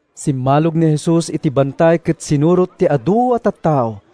Simmalog ni Jesus iti bantay ket sinurot ti adu a tattao.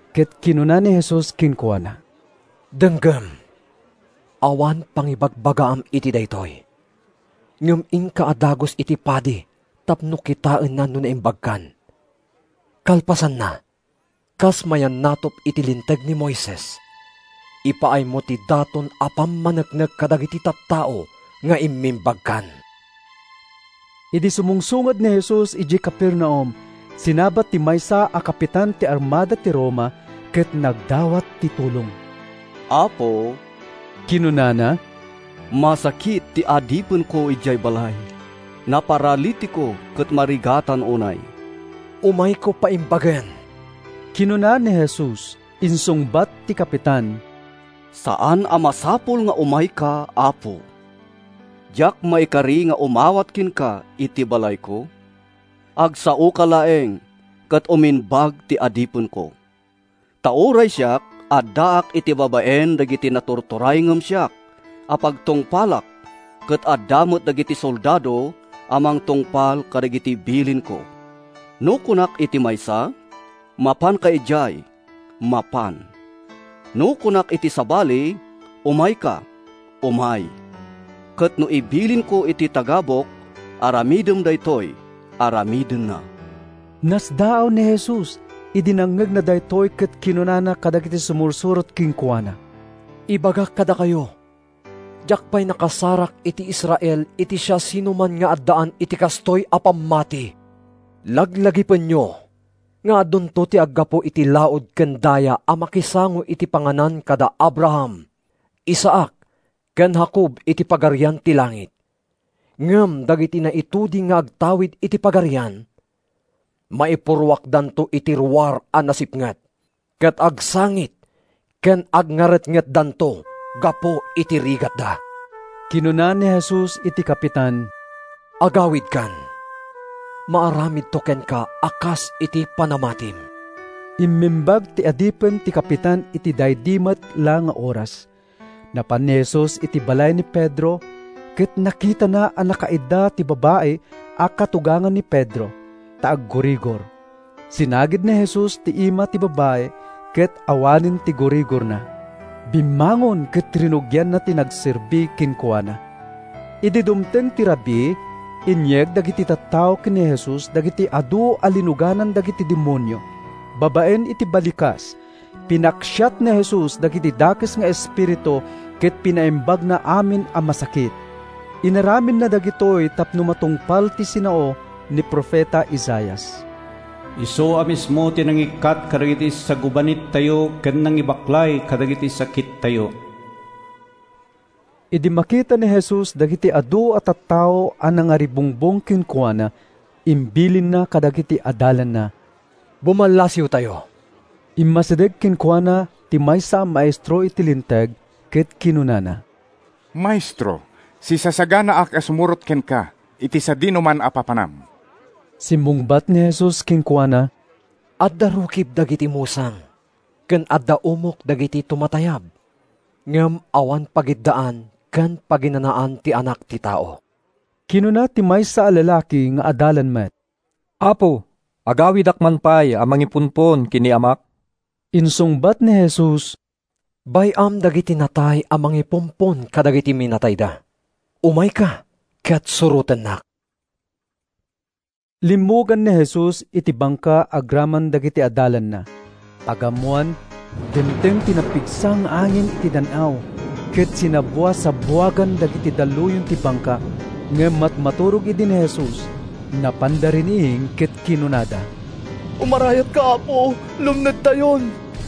Ket kinuna ni Jesus kenkuana, “Denggem! Awan pangibagbagaam iti daytoy, ngem inka a dagus iti padi tapno kitaenna no naimbagkan. Kalpasanna, kas mayannatup iti Linteg ni Moises, ipaaymo ti daton a pammaneknek kadagiti tattao nga immimbagkan.” Idi sumungsungad ni Jesus idiay Capernaum, sinabat ti maysa a kapitan ti armada ti Roma ket nagdawat iti tulong. “Apo,” kinunana, “masakit ti adipenko idiay balay; naparalitiko ket marigatan unay.” “Umayko paimbagen,” kinuna ni Jesus. Insungbat ti kapitan, “Saan a masapul nga umayka, Apo. Diak maikari nga umawat kenka iti balayko. Agsaoka laeng ket umimbag ti adipenko. Ta uray siak, addaak iti babaen dagiti naturturay ngem siak a pagtungpalak ket adda met dagiti soldado a mangtungpal kadagiti bilinko. No kunak iti maysa, ‘Mapanka idiay,’ mapan. No kunak iti sabali, ‘Umayka,’ umay. Ket no ibilinko iti tagabuk, ‘Aramidem daytoy,’ aramidenna.” Nasdaaw ni Jesus idi nangngegna daytoy ket kinunana kadagiti sumursurot kenkuana: “Ibagak kadakayo, diak pay nakasarak iti Israel iti siasinoman nga addaan iti kastoy a pammati. Laglagipenyo nga adunto ti aggapu iti laud ken daya a makisango iti panganan kada Abraham, Isaac ken Jacob iti Pagarian ti langit. Ngem dagiti naituding nga agtawid iti Pagarian, maipurruakdanto iti ruar a nasipnget, ket agsangit ken agngaretngetdanto gapu iti rigatda.” Kinuna ni Jesus iti kapitan, “Agawidkan. Maaramidto kenka a kas iti panamatim.” Immimbag ti adipen ti kapitan iti daydi met la nga oras. Napan ni Jesus iti balay ni Pedro, ket nakitana a nakaidda ti babai a katugangan ni Pedro, ta aggurigor. Sinagid ni Jesus ti ima ti babai ket awanen ti gurigorna. Bimmangon ket rinugianna ti nagserbi kenkuana. Idi dumteng ti rabii, inyeg dagiti tattao ken ni Jesus dagiti adu a linuganan dagiti demonio. Babaen iti balikas, pinaksiat ni Jesus dagiti dakes nga espiritu ket pinaimbagna amin a masakit. Inaramidna dagitoy tapno matungpal ti sinao ni profeta Isaias: “Isu a mismo ti nangikkat kadagiti sagubanittayo ken nangibaklay kadagiti sakittayo.” Idi makita ni Jesus dagiti adu a tattao a nangaribungbong kenkuana, imbilinna kadagiti adalanna, “Bumallasiwtayo.” Immasideg kenkuana ti maysa a maestro iti Linteg ket kinunana, “Maestro, sisasaganaak a sumurot kenka iti sadinoman a papanam.” Simmungbat ni Jesus kenkuana, “Adda rukib dagiti musang, ken adda umok dagiti tumatayab, ngem awan pagiddaan ken paginanaan ti Anak ti Tao.” Kinuna ti maysa a lalaki nga adalan met, “Apo, agawidak man pay a mangipumpon ken ni amak.” Insungbat ni Jesus, “Bay-am dagiti natay a mangipumpon kadagiti minatayda; umayka ket surotennak.” Limmugan ni Jesus iti bangka agraman dagiti adalanna. Pagammoan, dimteng ti napigsa nga angin iti dan-aw ket sinabbuasabbuagan dagiti dalluyon ti bangka. Ngem matmaturog idi ni Jesus. Napanda riniing ket kinunada, “Umarayatka, Apo! Lumnedtayon!”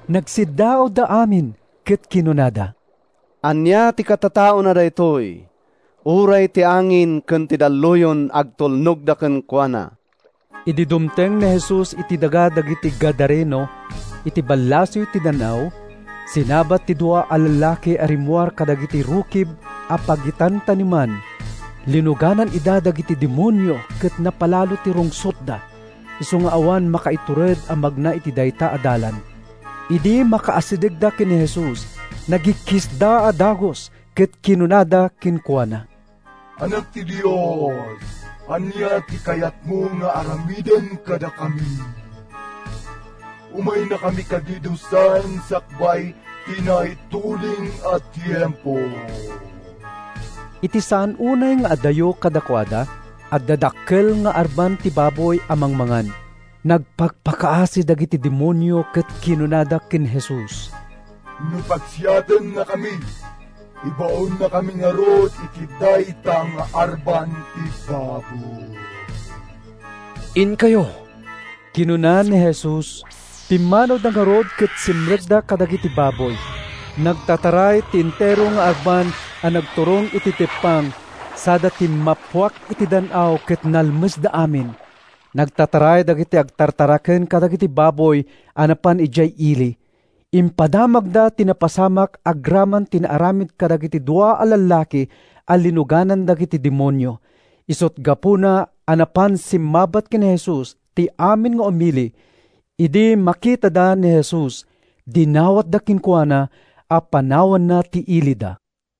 Nagsiddaawda amin ket kinunada, “Ania ti katataona daytoy? Uray ti angin ken ti dalluyon agtulnogda kenkuana!” Idi dumteng ni Jesus iti daga dagiti Gadareno, iti ballasiw ti dan-aw, sinabat ti dua a lallaki a rimmuar kadagiti rukib a pagitantaneman. Linuganan ida dagiti demonio ket napalalo ti rungsotda, isu nga awan makaitured a magna iti dayta a dalan. Idi makaasidegda ken Jesus, nagikkisda a dagus ket kinunada kenkuana, “Anak ti Dios, ania ti kayatmo nga aramiden kadakami? Umaynakami kadi dusaen sakbay ti naituding a tiempo?” Iti saan unay nga adayo kadakuada, adda dakkel nga arban ti baboy a mangmangan. Nagpakpakaasi dagiti demonio ket kinunada ken Jesus, “No paksiatennakami, ibaonnakami ngarud iti dayta nga arban ti baboy.” “Inkayo,” kinuna ni Jesus. Pimmanawda ngarud ket simrekda kadagiti baboy. Nagtataray ti entero nga arban a nagturong iti teppang sada timmappuak iti dan-aw ket nalmesda amin. Nagtataray dagiti agtartaraken kadagiti baboy a napan idiay ili. Impadamagda ti napasamak agraman ti naaramid kadagiti dua a lallaki a linuganan dagiti demonio. Isut’ gapuna a napan simmabat ken ni Jesus ti amin nga umili. Idi makitada ni Jesus, dinawatda kenkuana a panawanna ti ilida.